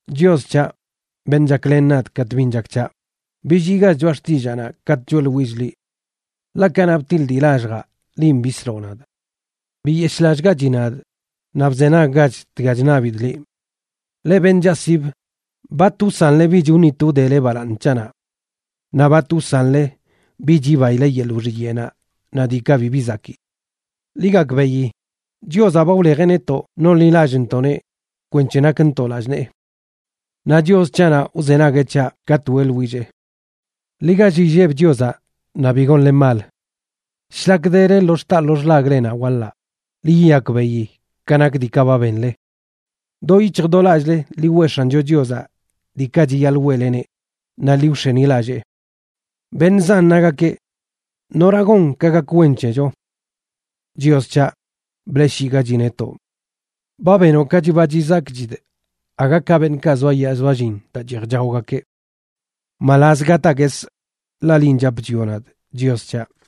Chios c̱haꞌ, beṉꞌ chaklen nadꞌ katꞌ bin chak c̱haꞌ, billiigach choꞌa xtillaanaꞌ katꞌ choeꞌḻwillꞌ liꞌ. Ḻaꞌ kanaꞌ btiḻꞌ dii lalljaꞌ, linꞌ bisloꞌ nadꞌ. Biyeshꞌlallꞌgachi nadꞌ, naꞌ bzenaggach dga chṉabidꞌ liꞌ. Leꞌ beṉꞌ chaꞌsibə, ¿bat wsanle bich wṉit wdele balaaṉ c̱haꞌnaꞌ? Naꞌ ¿bat wsanle bich yibaile yeḻꞌ wxiyeꞌnaꞌ naꞌ diikaꞌ bibi zakii? Ḻi gakbeꞌi, Chiozaꞌ ba wlejeꞌ netoꞌ nonḻilallꞌntoꞌneꞌ kwenc̱he nakntoꞌ lallꞌ nee. Naꞌ Chios c̱haꞌnaꞌ wzenagueꞌ c̱haꞌ katꞌ weꞌḻwillee. Ḻi gall illeb Chiozaꞌ naꞌ bi gonle mal. Shlak dele lo xtaa lo xḻaglenaꞌ waḻaꞌ, ḻi yiyakbeꞌi ka nak diikaꞌ ba benle. Do yic̱hj do lallꞌle ḻi weꞌ X̱ancho Chiozaꞌ diikaꞌ chiyaḻꞌ weꞌleneꞌ, naꞌ ḻi wx̱enilallee. Beṉꞌ zan nagakeꞌ: “¿Nora gon ka gak wen c̱hecho?” Chios c̱haꞌ, bleꞌshiꞌgachi netoꞌ. Ba benoꞌ ka chiba chizakchidꞌ aga ka beṉꞌkaꞌ zoayaa zoallin daa cheej chaogakeꞌ. Mbalaz gataa guesꞌ, ḻaꞌ linꞌ chap chwioꞌ nadꞌ, Chios c̱haꞌ.